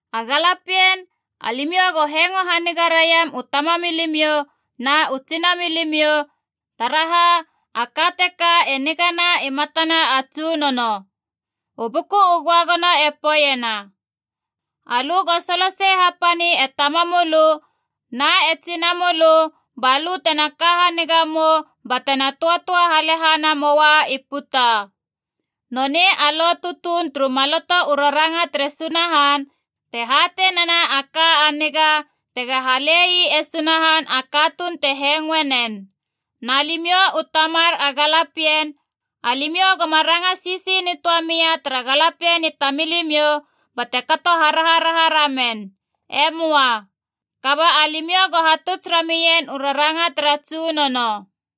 A galapien, alimiou go hengo haniga raiam u tamamilimiou na u tsinamilimiou, taraha a ka teka e nigana i matana a Tsunono. U Buku u Göagono e poeiena, alö go solosei hapani e tamamölö na e tsinamölö ba lö tena ka haniga mou batena töatöa halehana moa i puta. Nonei a lo tutuun turu Maloto u Raranga tere Sunahan te hatei nena a ka a niga tega hale ii e Sunahan a katuun te hengoe nen. Na limiou u tamar a galapien, alimiou goma ranga sisi nitöa mia tara galapien i tamilimiou bate kato haraharaha ramen. E möa. Kaba alimiou go hatuts ramien u raranga tara Tsunono.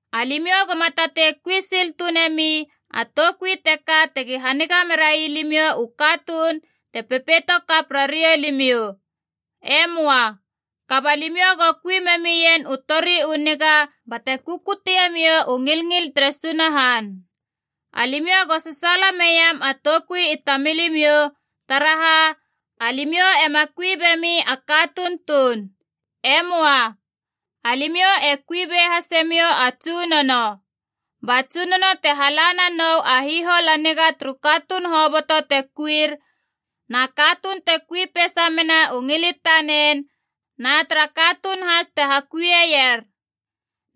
Alimiou goma tatei kui sil tuun nemi a toukui teka tegi haniga merai limiou u katuun te pepeito kap rariou limiou. E möa. Kaba limiou go kui memien u tori u niga bate kukutie miou u ngilngil tere Sunahan. Alimiou go sasaala meiam a toukui i tamilimiou, taraha alimiou ema kui bemi a katuun tuun. E möa. Alimiou e kuibe hase miou a Tsunono. Ba Tsunono te hala nanou a hihol a niga turu katuun hoboto te kuir, na katuun te kui peisa mena u ngil i tanen na tara katuun has te hakuie ier.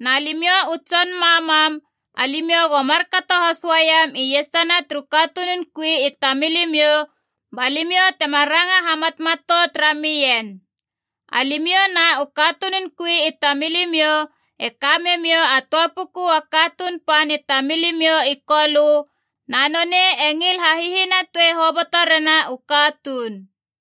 Na limiou u tson mammam, alimiou go markato has uaiam iesana turu katunun kui i tamilimiou, ba limiou tema ranga hamatmatout ramien. Alimiou na u katunun kui i tamilimiou e ka memiou a töa puku a Katuun Pan i tamilimiou i Kolö, na nonei e ngil hahihinatoe hoboto rena u katuun.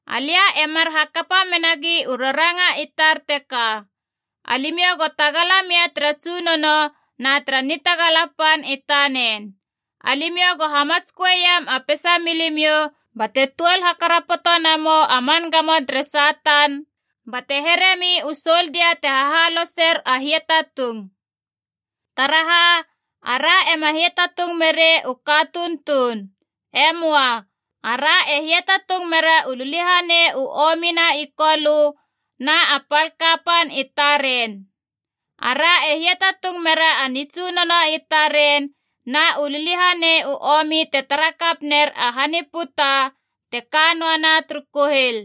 Alia e mar hakapa menagi u raranga i tar teka. Alimiou go tagala mia tara Tsunono na tara nitagala pan i tanen. Alimiou go hamatsköe iam a peisa milimiou bate tuol hakarapoto namou a man gamo tere Satan, bate heremi u soldia te hahaloser a hiatatung. Taraha, ara ema hiatatung merei u katuun tuun. E möa. Ara e hiatatung mera u liliahanei u omi na i kolö na a pal kapan i taren. Ara e hiatatung mera a nitsunono i taren na u liliahanei u omi te tara kap ner a han i puta te ka noana turu kuhil.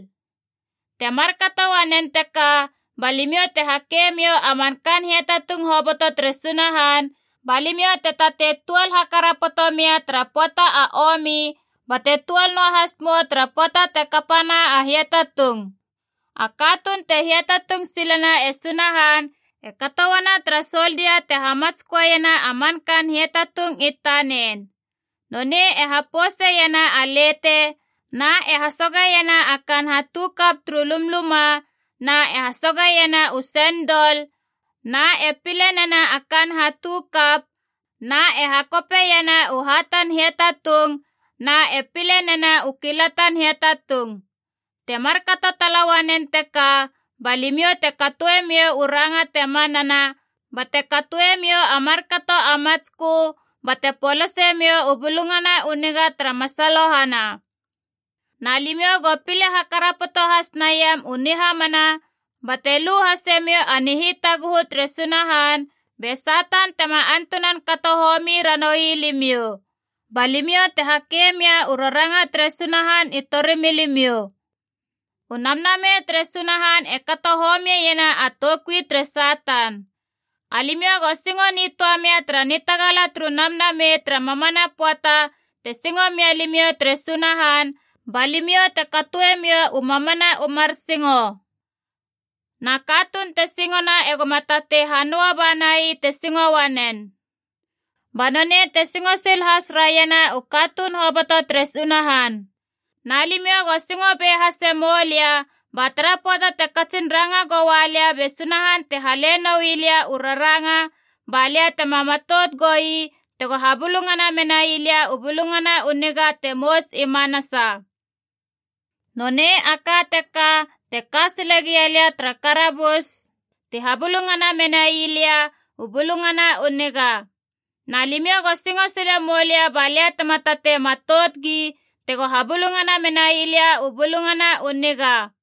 Te markato uanen teka ba limiou te hake miou a man kaan hiatatung hoboto tere Sunahan ba limiou te tatei tuol hakarapoto mia tara pöata a omi bate tuol noa has mou tara pöata te kapana a hiatatung. A katuun te hiatatung silena e Sunahan e kato uana tara soldia te hamatsköena a man kaan hiatatung i tanen. Nonei e hapouseiena a lete na e hasogeiena a kaan hatukap turu lumluma na e hasogeiena u sendol na e pile nena a kaan hatukap na e hakopeiena u hatan hiatatung na e pile nena u kilatan hiatatung. Te markato tala uanen teka ba limiou te katoemiou u ranga te manana bate katoemiou a markato a matskö bate polasemiou u Bulungana u Niga tara masalohana. Na limiou go pile hakarapoto has naiam u nihamana bate lu hasemiou a nihitaguhu tere Sunahan, be Satan tema antunan kato homi ranoui limiou. Ba limiou te hake mia u raranga tere Sunahan i torimilimiou. U Namnamei tere Sunahan e kato homieiena a toukui tere Satan. Alimiou go singo nitöa mia tara nitagala turu Namnamei tara mamana pöata te singo mia limiou tere Sunahan, ba limiou te katoemiou u mamana u mar singo. Na katuun te singona egoma tatei hanöa bana ii te singo uanen, ba nonei te singo sil has raiena u katuun hoboto tere Sunahan. Na limiou go singo be hase moulia, ba tara pöata te katsin ranga goua lia be Sunahan te hale noui lia u raranga, ba lia tema matout goui tego habulungana menai lia u Bulungana u Niga te mous i manasa. Nonei a ka teka te ka sile gia lia tara karabus, ti habulungana menai lia u Bulungana u Niga. Na limiou go singo sile moulia balia tema tatei matout gi tego habulungana menai lia u Bulungana u Niga.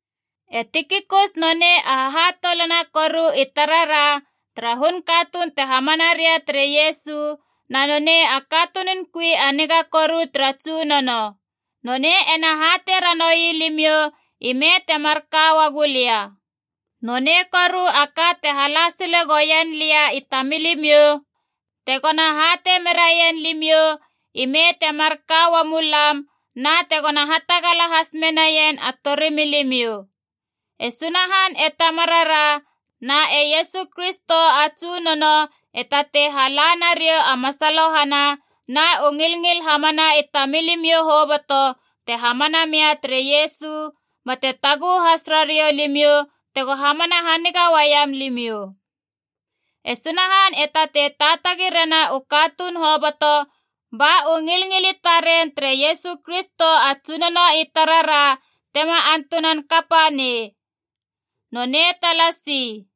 E Tikikus nonei a hahatoulana koru i tarara tara hun katuun te hamana ria tere Iesu, na nonei a katunun kui a niga koru tara Tsunono. Nonei ena hatei ranoui limiou ime te marka uagu lia. Nonei koru a ka te hala sile gouien lia i tamilimiou, tegona hatei meraien limiou ime te marka uamu lam na tegona hatagala has menaien a torimilimiou. E Sunahan e Tamarara na e Iesu Kristo a Tsunono e tatei hala nariou a masalohana na u ngilngil hamana i tamilimiou hoboto te hamana mia tere Iesu, bate taguhu has rariou limiou tego hamana haniga uaiam limiou. E Sunahan e tatei taatagi rena u katuun hoboto, ba u ngilngil i taren tere Iesu Kristo a Tsunono i tarara tema antunan kapa nei. Nonei talasi.